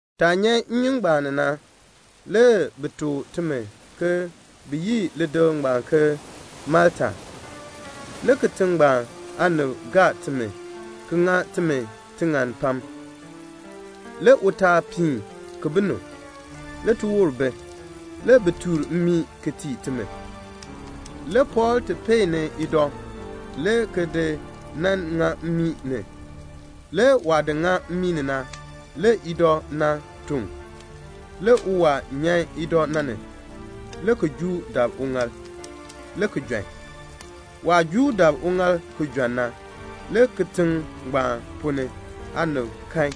Taah nyan nnyun ngbaan ni na, le bi tuk timi ke bi yi lidikl ngbaan ke Malta. Le kitiŋ ngbaan aanib gaa timi ki ŋa timi tiŋann pam. Le utaal piin ki bi nu, le tiwoor bi. Le bi tuur mmii ki tii timi. Le Pɔɔl ti peeni idɔ, le ki nan di ŋa mmii ni. Le waah di ŋa mmii ni na, le idɔ na tɔŋ. Le uwaa nyan idɔ na ni, le ki juu dab uŋaal, le ki jɔn. Waah juu dab uŋaal ki jɔn na, le kitiŋ ngbaan ponn ni aanib kan,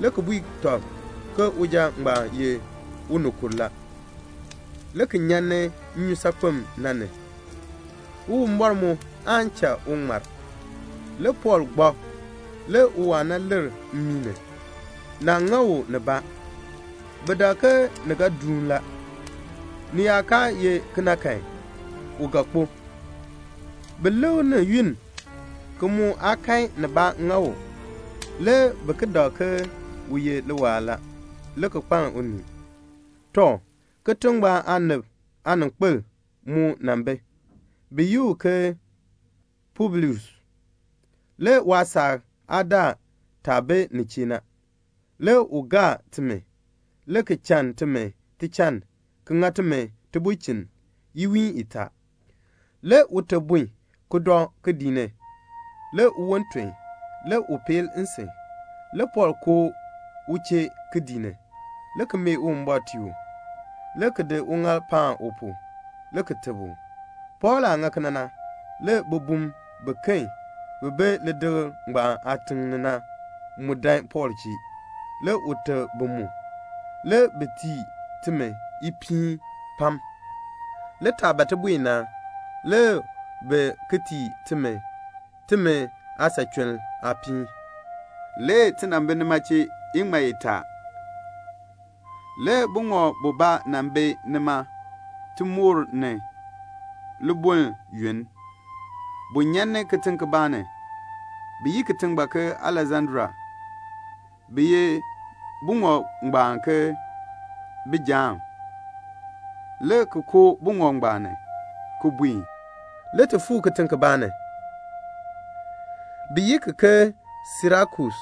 le ki bui tɔb ke uja ngbaan ye unikur la, le ki nyan ni nnyusaakpem na ni; Uwumbɔr mu aan cha u ŋmar. Le Pɔɔl gbak, le uwaa na lir mmii ni. Naa ŋa u nibaa. Bi dak ke ni ga duun la, ni yaa kaa ye kena kan, u ga kpo. Bi lik ni yunn, ki mu aa kan nibaa ŋa u. Le bi ki dak ke u ye liwaal la, le ki kpaln unii. Tɔ, kitiŋ ngbaan aanib aaninkpil mu nan bi. Bi yi u ke Publius. Le waasaak aa daa taah bi nin chee na. Le u gaa timi, le ki chann timi tichann ki ŋa timi tibulchin iwiin itaa. Le ute bun, ki dɔ kidiik ni. Le uwon ton, le u peel nsin. Le Pɔɔl koo u chee kidiik ni, le ki mee Uwumbɔr tii u, le ki di uŋaal paan u pu, le ki teb u. Pɔɔl aah ŋa kena na, le bibum biken bi bi lidikl ngbaan aatiŋ ni na mu dan Pɔɔl chee, le u teb bi mu. Le bi tii timi ipiin pam. Le taah ban ti buen na, le bi ki tii timi, timi aasachuln aapiin. Le ti nan bi nima iŋmal itaa. Le buŋɔb bubaa nan bi nima tiwoor ni libuln yoonn. Bu nyan ni kitiŋ kibaa ni, bi yi ki ke Aleksandria. Bi yi buŋɔb ngbaan ke "Bijaam." Le ti koo buŋɔb ngbaan ni, ki buen. Le ti fuu kitiŋ kibaa ni, bi yi ki ke Sirakus,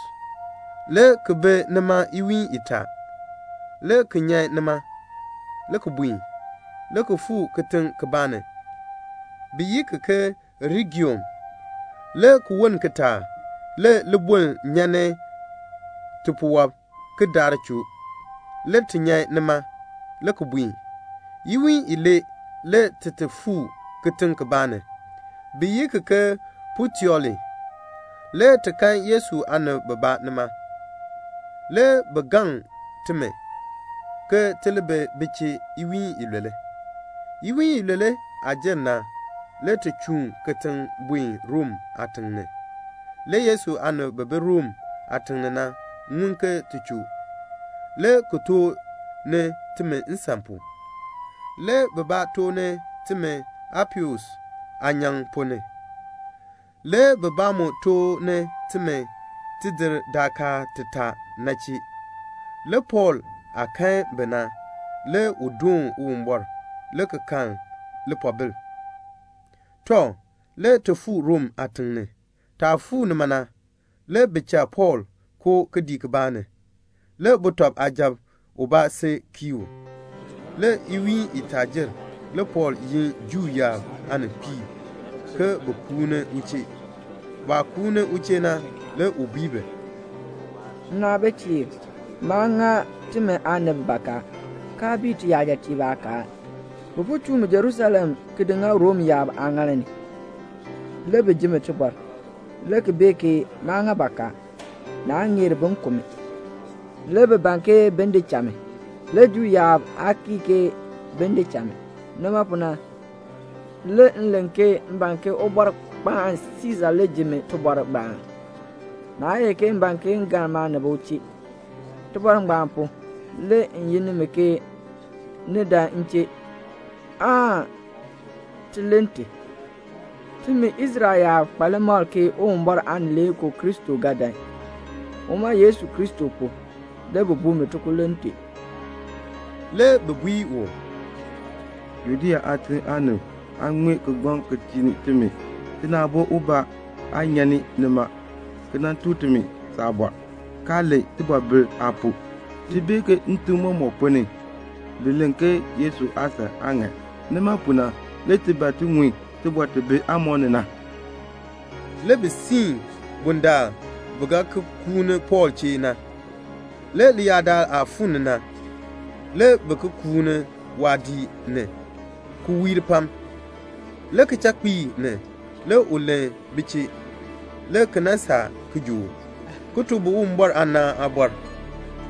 le ki bi nima iwiin itaa, le ki nyan nima, le ki buen, le ki fuu kitiŋ kibaa ni, bi yi ki ke Regium. Le ki woln kitaak, le libuln nyan ni tipuwɔb, ki daar choo. Le ti nyan nima, le ki buen. Iwiin ilee le ti ti fuu kitiŋ kibaa ni, bi yi ki ke Puteoli. Le ti kan Yesu aanib bibaa nima. Le bi gaŋ timi ke ti li bi bi chee iwiin ilule. Iwiin ilule aah jer na, le ti chuun kitiŋ buen Rom aatiŋ ni. Le Yesu aanib bi bi Rom aatiŋ ni na ŋun ke ti choo. Le bi tooh ni timi nsan pu. Le bibaa tooh ni timi Apius Aanyaŋ ponn ni, le bibaa mu tooh ni timi Tidir Daakaan Titaa na chee. Le Pɔɔl aah kan bi na, le u doon Uwumbɔr, le ki kan lipoobil. Tɔ, le ti fuu Rom aatiŋ ni. Taah fuu nima na, le bi cha Pɔɔl koo kidiik kibaa ni, le suja ubaa si kii u. Le iwiin itaa jer. Le Pɔɔl yin Juu yaab aaninkpiib ke bin kuun ni u chee. Baah kuun ni u chee na, le u bui bi, "Nnaabitiib, maa ŋa timi aanib bakaa, kaa bii tiyajatiib aakaal. Bi po chuu mi Jerusalem le ki di ŋa Rom yaab aaŋaal ni. Le bi ji mi tibɔr, le ki bee ke maa ŋa bakaa, naa ŋeer bin ku mi. Le bi ban ke bin di cha mi. Le Juu yaab aa kii ke bin di cha mi. Nima pu na, le m len ke m ban ke Ubɔrkpaan Siisa le ji mi tibɔr ngbaan. Naa ye ke m ban ke m galn maanib u chee. Tibɔr ngbaan pu, le m yin nimi ke ni dan m chee, aan ti len ti. Timi Israel yaab kpa limakl ke Uwumbɔr Aanileekoo Kristo ga dan. Uma le pu, le bi buu mi tikululn tee." Le bi bui u, "Judea aatiŋ aanib aa ŋmee saabɔr kigbaŋ ki tii ni timi. Tina aabo ubaa aa nyan ni nima, ki nan tuk timi saabɔr, kaa len tibɔbil aa pu. Ti bee ke ntim mɔmɔk ponn ni, bi len ke Yesu aasan aa ŋan. Nima pu na, le ti ban ti ŋun tibɔr ti bi aamɔb ni na." Le bi siin bundaln bi ga ki kuun Pɔɔl chee na. Le leyaadaal aah fuu ni na, le bi ki kuun waadiik ni, ki wiir pam. Le kichakpiik ni le u len bi chee, le ki nan saa kijook, ki tuk bi Uwumbɔr aanaan aabɔr,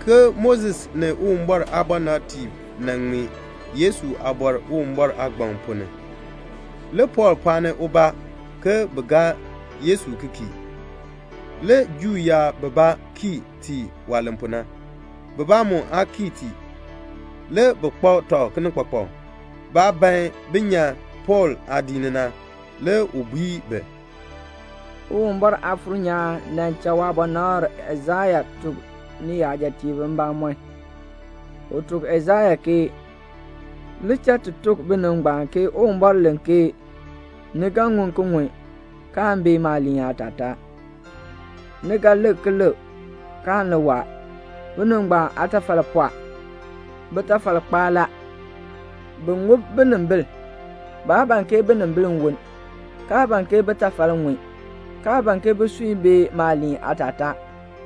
ke Moses ni Uwumbɔr aabɔnabtiib nan ŋmee Yesu aabɔr Uwumbɔr aagbaŋ ponn ni. Le Pɔɔl pɔɔni ubaa ke bin gaa Yesu ki kii. Le Juu yaab bibaa kii tii waah len pu na, bibaa mu aa kii tii. Le bi kpak tɔb kinikpakpak. Baah ban bin nyan Pɔɔl aadiik ni na, le u bui bi, "Uwumbɔr Aafuur nyaan nan cha waabɔnabr Aisaya tuk niyajatiib mbamɔn. U tuk Aisaya ke 'Li cha ti tuk binib ngbaan ke Uwumbɔr len ke ni ga ŋun ki ŋun, kaan bee maaliin aatataa. Ni ga lik ki lik, kaan li waa. Binib ngbaan aatafal pɔɔ. Bitafal kpaa la. Bi ŋub binimbil. Baa ban ke binimbil li woln, kaa ban ke bitafal ŋun, kaa ban ke bisui bee maaliin aatataa,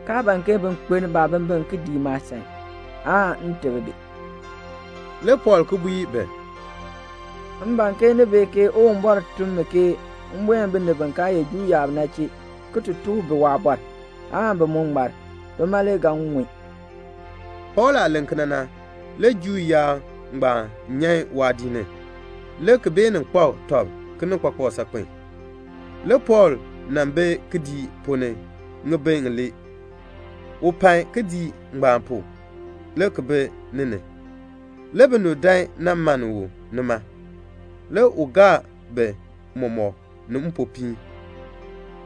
kaa ban ke bin kpeln baabimbin ki dii maasan, aan m teb bi."' Le Pɔɔl ki bui bi, "M ban ke ni bee ke Uwumbɔr tun mi ke m buen binib bi kaa ye Juu yaab na chee, ki ti tuk bi waabɔr, aan bi mu ŋmar. Bima le ga ŋun." Pɔɔl aah len kena na, le Juu yaab ngbaan nyan waadiik ni, le ki beenin kpak tɔb kinikpakpak saakpen.] Le Pɔɔl nan bi kidiik ponn ni ŋibin ŋilee. U pai kidiik ngbaan pu, le ki bi ni ni. Le binib dan nan mann u nima. Le u gaa bi mɔmɔk ni mpopiin.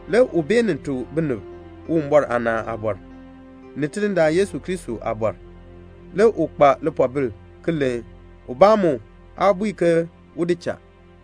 Le u beenin tuk binib Uwumbɔr aanaan aabɔr, ni Tidindaan Yesu Kristo aabɔr. Le u kpa lipoobil ki len. Ubaa mu aa bui ke un di cha.